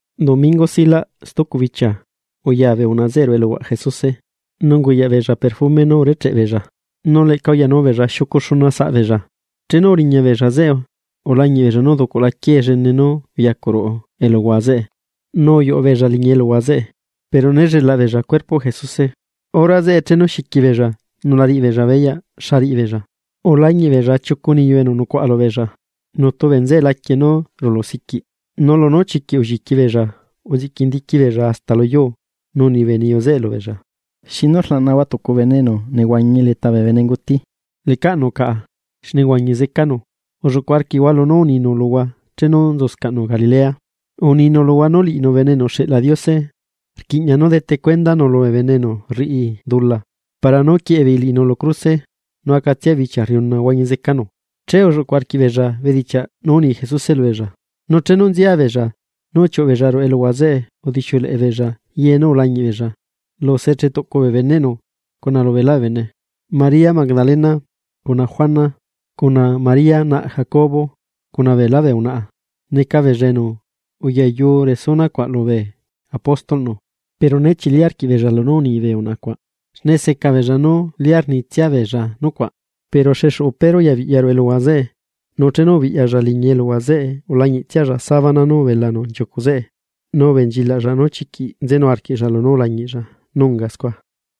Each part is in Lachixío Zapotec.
Domingo silaꞌ stucu bichia, uya bee unaꞌa zeꞌe ruꞌu eluhuaꞌ Jesuse, nu unguyaꞌ beella perfume nú urecheꞌ beella, nu leꞌca uyanu beella xiucu xuna bee unaꞌa. Chenu uriña beella zeꞌe, ulañiꞌ beella nú uducuꞌla quiee llene nú uyacuꞌ ruꞌu eluhua zeꞌe. Nu uyuꞌu beella liñi eluhua zeꞌe, pero né lleꞌlaꞌ beella cuerpoꞌ Jesuse. Hora zeꞌe chenu xiqui beella nu la riꞌi beella beyaꞌ xa riꞌi beella, ulañiꞌ beella chiucu niyu enu nzulí axu lubeella, nutu bee nzeꞌe laquie nú rulu siquiꞌ. Nu lunú chiquiꞌ ulliqui beella uziꞌqui ndiqui beella hasta lu yuu, nu uni bee niyu zeꞌe lubeella: ―¿Xinu rlaꞌnahua tucu bene enu nehuañi leta bee bene nguti? Lecaꞌnu caꞌa, xne uhuañi zecanu. Ulluꞌcu arquiꞌhua lunú uninu luhua chenu nzuscaꞌnu Galilea. Uninu luhua nú liꞌinu Bene enu uxeꞌla Diose, rquiꞌña nú dete cuendanu lubee bene enu rriꞌi dula para nú quieꞌe beei liꞌinu lu cruse, nu acatsia bichia rriuna huañi zecanu. Che ulluꞌcuꞌ arquiꞌbeella bedichiaꞌ nú uni Jesuse lubeella, nu chenu nzia beella nú uchiuꞌu beella ruꞌu eluhua zeꞌe udixiuleꞌe beella ye nú ulañiꞌ beella lu se chetuꞌcu bee beneꞌnu cuna lu beelá bee bene. María Magdalena, cuna Juana, cuna María naꞌ Jacobo, cuna beela bee unaꞌa, neca beella enu uyayu resuna cuaꞌ lubee apóstolꞌnu. Pero né chili arquiꞌbeella lunú uni bee unaꞌa cuaꞌ, xne seca beella nú lia rnitsia beella nucuaꞌ. Pero xexuꞌu Pedro uyabiꞌya ruꞌu eluhua zeꞌe, nu chenu ubiꞌyalla liñii, ulañiꞌtsialla sabana nú ubelanu nchiucuꞌ zeꞌe, nu ubenchilaꞌlla nu chiquiꞌ nzenu arquiꞌlla lunú ulañiꞌlla nu unga scua.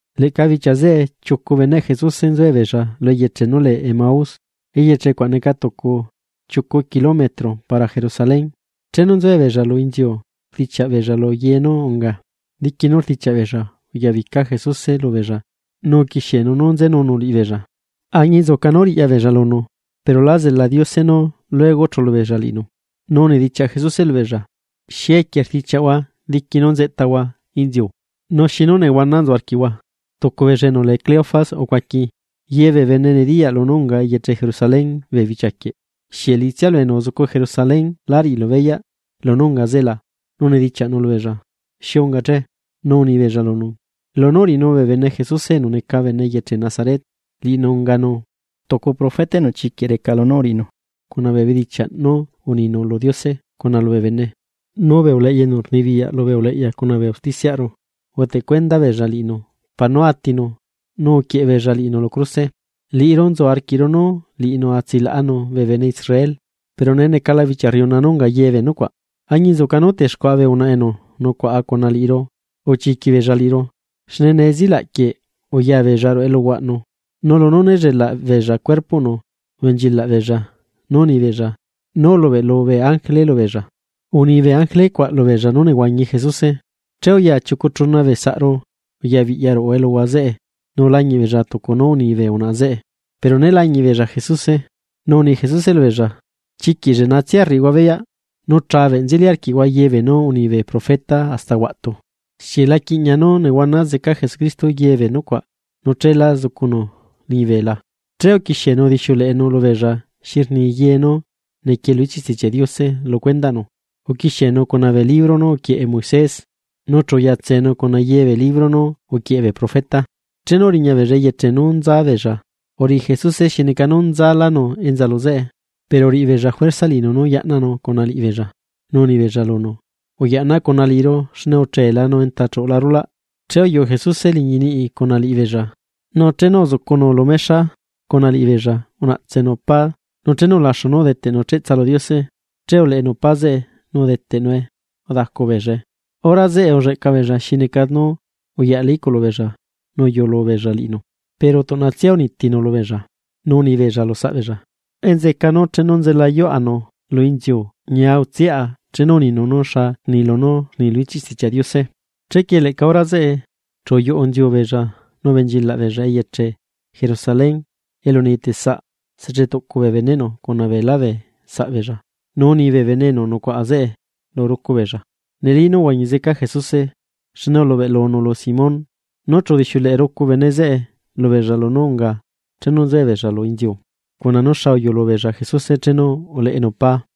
Leꞌca bichia zeꞌe, chiucu beneꞌ Jesuse nzuebeella lu eyeche nú lee Emaús, eyeche cuaꞌ neca tucu chetuꞌcu kilómetro para Jerusalén. Chenu nzuebeella lu inziu rdichiaꞌ beella lu ye nú unga. Diqui nú rdichiaꞌ beella, uyabica Jesuse lubeella nu uquixienu nú nzenunu liꞌibeella. Añinzuca nú riꞌya beella lunu, pero la zela Diose nú luego chulu beella liꞌinu. Nu unidichiaꞌ Jesuse lubeella: ―¿Xi equie rdichiaꞌhua diqui nú nzeꞌtahua inziu? Nu xinu nehuana nzu arquiꞌhua. Tucu beella enu lee Cleofas, ucuaqui: ―Ye bee bene nediyaꞌ lunú unga eyeche Jerusalén bee bichiaquieꞌ. ¿Xieꞌ liꞌitsialu enu uzucu Jerusalén lá riꞌilu beyaꞌ lunú unga zeꞌe la? Nu unidichiaꞌnu lubeella: ―¿Xi unga che? Nu uni beella lunu: ―Lunú uriꞌinu bee bene Jesuse enu neca bene eyeche Nazaret, liꞌinu unganu tucu profeta enu chiquiꞌ reca lunú uriꞌinu cuna bee bedichiaꞌ nú uninu lu Diose, cuna lubee bene. Nu bee uleꞌya enu rnibiyaꞌ lubee uleꞌya cuna bee usticiaꞌru, udeteꞌ cuenda beella liꞌinu para nú atinu nu uquieꞌe beella liꞌinu lu cruse. Liꞌiru nzu arquiꞌru nú liꞌinu a tsilaꞌanu bee bene Israel. Pero nee necala bichia rriuna nú unga ye bee nucuaꞌ. Añinzuca nú texcuaꞌa bee unaꞌa enu nucuaꞌa cuna liꞌiru uchiiqui beella liꞌiru, xne nee zilaꞌ quieꞌ uya beella ruꞌu eluhuaꞌnu, nu lunú néllelaꞌ beella cuerpoꞌnu, ubenchilaꞌ beella nu uni beella nú ulubeꞌlu bee ángele lubeella, uni bee ángele cuaꞌ lu beella nú nehuañi Jesuse. Che uya chiucu chuna bee saꞌru uyabiꞌya ruꞌu eluhua zeꞌe, nu ulañiꞌ beella tucu nú uni bee unaꞌa zeꞌe, pero né lañiꞌ beella Jesuse. Nu uni Jesuse lubeella: ―¡Chiquiꞌ lleꞌnatsia rriꞌihua beyaꞌ, nu rleꞌe nzeli arquiꞌhua ye bee nú uni bee profeta hasta huaꞌtu! ¿Xieꞌ la quiꞌña nú nehuana zeca Jesucristo ye bee nucuaꞌ nu cheelá zucunu liñibe la? Che uquixienu udixiuleꞌenu xi rni ye nú niquie lu ichiꞌ Stichiaꞌ Diose lu cuendaꞌnu. Uquixienu cuna bee libro nú uquieꞌe Moisés, nu chu uquixiaꞌlanu cuna ye bee libro nú uquieꞌe bee profeta. Chenu uriña beella eyeche nú nza beella, uriꞌi Jesuse tucu nú nzalanu enza lu zeꞌe. Pero uriꞌi beella juerza liꞌinu nú yaꞌnanu cuna liꞌibeella, nu uni beella lunu: ―Uyaꞌna cuna liꞌiru, xne ucheela nu enta chuꞌula rulaꞌ. Che uyuꞌu Jesuse nu uyaꞌnanunu liꞌi beella. Nu chenu nzucunu lu mexa cuna liꞌibeella unaꞌtsenu pá, nu chenu ulaxu nú udeteꞌnu cheꞌtsa lu Diose, che uleꞌenu pá zeꞌe nu udeteꞌnue udacubeellae. Hora zeꞌe ulleꞌca beella xi neca nú uyaꞌla iꞌculu beella nu uyulu beella liꞌinu, pero tuꞌnatsia unitinu lubeella. Nu uni beella lu saꞌbeella: ―Enzeꞌeca nú chenu nzelayuaꞌa liꞌinu lu inziu ñia utsiꞌa chenu uninu nú xa rni lunú rni lu ichiꞌ Stichiaꞌ Diose. Chequie leꞌca hora zeꞌe, chu uyuꞌunziu beella nu ubenchilaꞌ beella eyeche Jerusalén, elu neyeteꞌ saꞌ sechetuꞌcu bee beneꞌnu cuna beelá bee saꞌ beella. Nu uni bee bene enu nucuaꞌa zeꞌe lu rucu beella: ―Neli nú uhuañi zeca Jesuse, xne ulubeꞌlulanu lu Simón. Nu chu udixiuleꞌe rucu bene zeꞌe lubeella lunú unga chenu nzuebeella lu inziu, cuna nú xa uyuꞌlu beella Jesuse chenu uleꞌenu pá.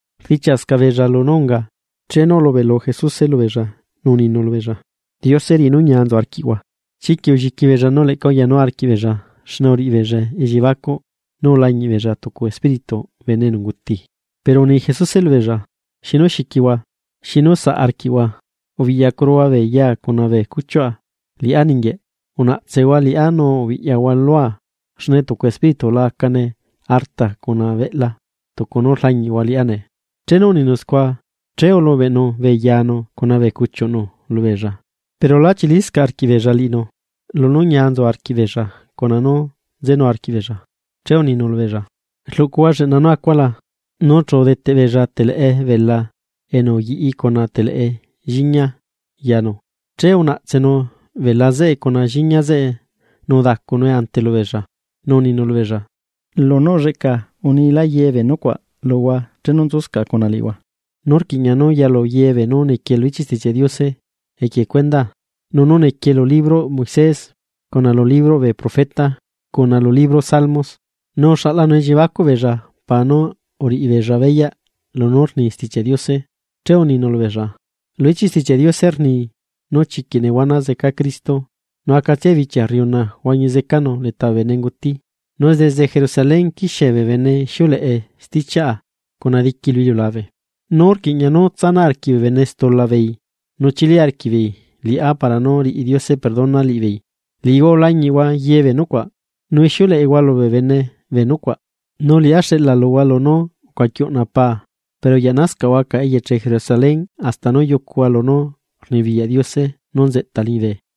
Rdichiaꞌscaꞌ beella lunú unga, chenu ulubeꞌlu Jesuse lubeella, nu uninu lubeella: ―La lliquihua ñia utsu arquiꞌhua. Chiquiꞌ ulliqui beella nu leꞌca uyanu arquiꞌbeella, xne uriꞌi beella elliebacuꞌ nú ulañiꞌ beella tucu espírituꞌ bene enu unguti. Pero uni Jesuse lubeella: ―¿Xinu xiquihua? nu ¿xinu saꞌ arquiꞌhua? Ubiꞌyacuruhua bee yaa cuna bee cuchiuꞌa. Liꞌá ninguieꞌ, unaꞌtsehua liꞌá nu ubiꞌyahua lua xne tucu espíritu la acane arta cuna beꞌla tucu nú rlañiꞌhua liꞌá nee. Chenu uninu scua, che ulubeꞌnu bee yanu cuna bee cuchiuꞌnu lubeella. Pero lá chiliscaꞌ arquiꞌbeella nu liꞌinu lunú ñia nzu arquiꞌ beella cuna nú nzenu arquiꞌbeella, che uninu lubeella: ―¿Rluꞌcuhua lleꞌna nú acua la? Nu chu udeteꞌ beella teleꞌe bela enu uyiꞌi cuna teleꞌe lliñia, che unaꞌtsenu bela zeꞌe cuna lliñia zeꞌe nu udacunue ante lubeella. Nu uninu lubeella: ―Lunú ulleꞌca ye bee nucuaꞌ unia luhua chenu nzuscaꞌa cuna liꞌihua. Nu rquiꞌña nú yalu ye beenú niquie lu ichiꞌ Stichiaꞌ Diose equie cuendaa nú nequie lu libroꞌ Moisés, cuna lu libroꞌ bee profeta, cuna lu libro salmos. Nu uxaꞌlanu elliebacuꞌ beella para nú uriꞌi beella beyaꞌ lunú rni Stichiaꞌ Diose. Che uninu lubeella: ―Lu ichiꞌ Stichiaꞌ Diose rni nú chiquiꞌ nehuana zeca Cristo, nu acatsia bichia rriuna huañi zecanu leta bee bene nguti. Nu desde Jerusalén quixie bee bene ixiuleꞌe stichiaꞌa cuna diqui lu iliulabe, nú rquiꞌña nú tsanaꞌ arquiꞌ bee bene stula beei, nu chili arquiꞌbeei liꞌá para nú riꞌi Diose perdona liꞌibeei. Liꞌihua ulañiꞌhua ye bee nucuaꞌ, nu ixiuleꞌehua lubee bene bee nucuaꞌ. Nu liꞌá xeꞌla luhua lunú ucuaqui uꞌna paa. Pero uyaꞌnascaꞌhua caꞌa eyeche Jerusalén hasta nú yucuhua lunú rnibiyaꞌ Diose nú nzeꞌta liñibe.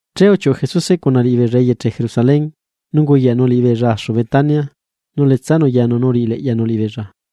Che uchiuꞌu Jesuse cuna liꞌibeella eyeche Jerusalén, nu unguyaꞌnu liꞌibeella axu Betania, nu uletsanu yanu nu uriꞌi leꞌyanu liꞌibeella.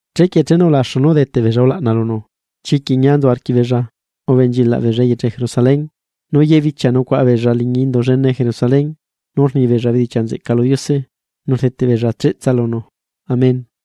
Chequie chenu ulaxu nú udeteꞌ beella ulaꞌna lunu, chiquiꞌ ñia nzu arquiꞌbeella ubenchilaꞌ beella eyeche Jerusalén. Nu ye bichia nucuaꞌa beella liñi Indu llene Jerusalén nu rni beella bedichiaꞌ nzeꞌca lu Diose, nu rdeteꞌ beella cheꞌtsa lunu. Amén.